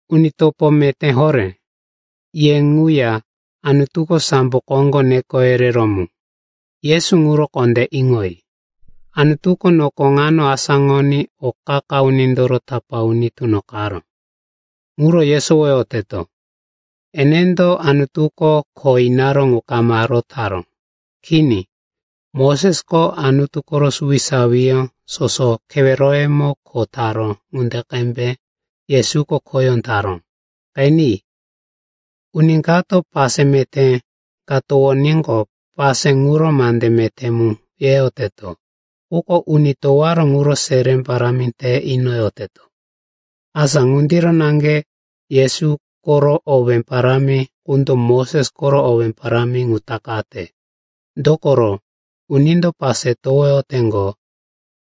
Uni topo meté horé, ye ŋuya Anutuko sambo koŋgo neko yereró mu, Yesu ŋuro kondé iŋoyi. Anutuko noko ŋano asáŋoní o qa-qa unindoro tapá uni tunoqaró, ŋuro yesowoyoteto. Enendo Anutuko kho inaró ŋu kama rotaró. Kini, Mosesko Anutu koro suwisawiyó soso keweroyemo kho taró ŋunde qembe Yesuko khoyó taró. Qeni, uni kato pase meté ka towoníqo, pase ŋuro mande meté mu yeyoteto, quko uni towaró ŋuro seré parámi te inoyoteto. Asa ŋundiro naŋge Yesu koro owé parámi qundo Moses koro owé parámi ŋu takate. Dokoro unindo pase towoyoteŋgo,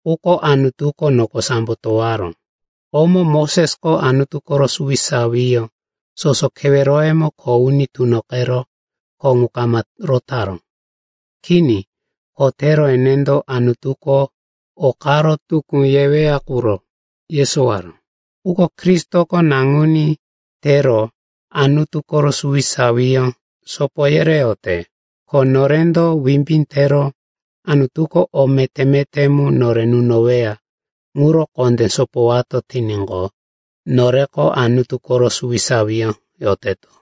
quko Anutuko noko sambo towaró. Komo Mosesko Anutu koro suwisawiyó soso keweroyemo kho uni tunoqero kho ŋu kama rotaró. Kini, kho tero enendo Anutuko o karo tukú yeweya quro yesowaró. Quko Kristoko naŋuní tero Anutu koro suwisawiyó sopo yereyote. Ko norendo wimbí tero Anutuko o meté-meté mu nore nunoweya ŋuro kondé sopowato tiníqo, noreko Anutu koro suwisawiyó yoteto.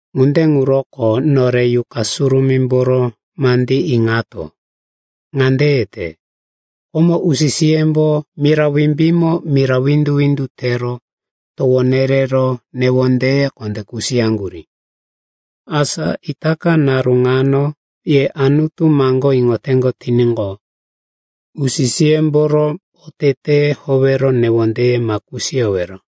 Ŋunde ŋuroko nore Yuqa Surumímboro mandí iŋato. Ŋande yete, “Komo usi-siyembo mira wimbímo mira windu-windu tero towo nerero newondeye kondé kusiyaŋgurí. Asa itaka naru ŋano ye Anutu maŋgó iŋoteŋgo tiníqo, usi-siyemboro oteteye howero newondeye ma kusiyowero.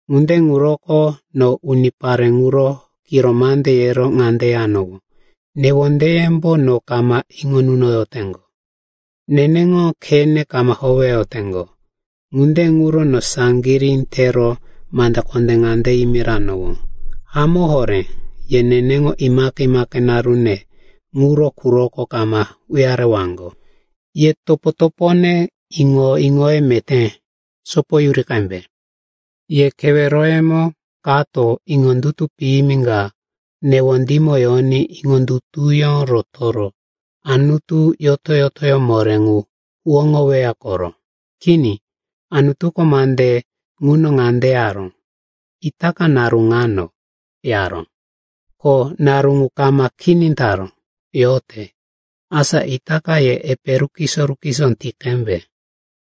Ŋunde ŋuroko no unipare ŋuro kiro mande yero ŋande yanowó, ‘Newondeyembo no kama iŋo nunoyoteŋgo. Neneŋo khene kama howeyoteŋgo.’ Ŋunde ŋuro no saŋgirí tero mande kondé ŋande yimiranowó, ‘Hamó horé ye neneŋo imaqe-imaqe narune ŋuro quroko kama uyarewaŋgo.’” Ye topo-topone, iŋo-iŋoye meté sopoyuri qembe. Ye keweroyemo kato iŋondutu piyimi ka newondímo yoní iŋondutuyó rotoro Anutu yoto-yotoyó moré ŋu huwóŋoweya koro. Kini, Anutuko mande ŋuno ŋande yaró, “Itaka naru ŋano,” yaró. Ko naru ŋu kama kini taró, yote. Asa itaka ye epe rukiso-rukiso ti qembe.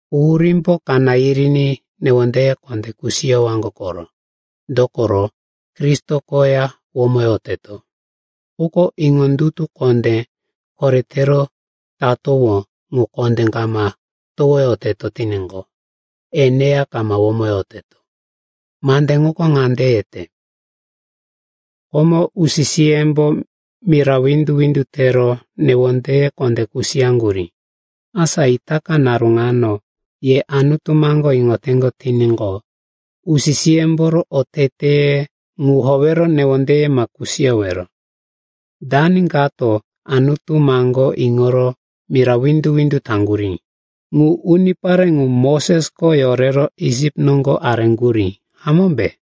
Quhurímbo kaná yiriní newondeye kondé kusiyowaŋgo koro. Dokoro Kristo koya womoyoteto. Quko iŋondutu kondé koretero tatowó ŋu kondé kama towoyoteto tiníqo, eneya kama womoyoteto. Mande ŋuko ŋande yete, “Komo usi-siyembo mira windu-windu tero newondeye kondé kusiyaŋgurí. Asa itaka naru ŋano ye Anutu maŋgó iŋoteŋgo tiníqo usi-siyemboro oteteye ŋu howero newondeye ma kusiyowero.” Dani kato Anutu maŋgó iŋoro mira windu-windu taŋgurí? Ŋu unipare ŋu Mosesko yorero Isip noŋgo areŋgurí, hamómbe?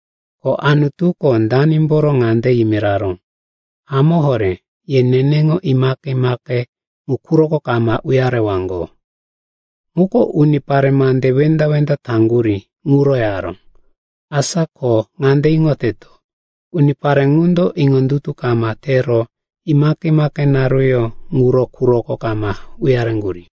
Ko Anutuko danimboro ŋande yimiraró, “Hamó horé ye neneŋo imaqe-imaqe ŋu quroko kama uyarewaŋgo?” Ŋuko unipare mande wenda-wenda taŋgurí ŋuro yaró. Asa ko ŋande iŋoteto, unipare ŋundo iŋondutu kama tero imaqe-imaqe naruyó ŋuro quroko kama uyareŋgurí.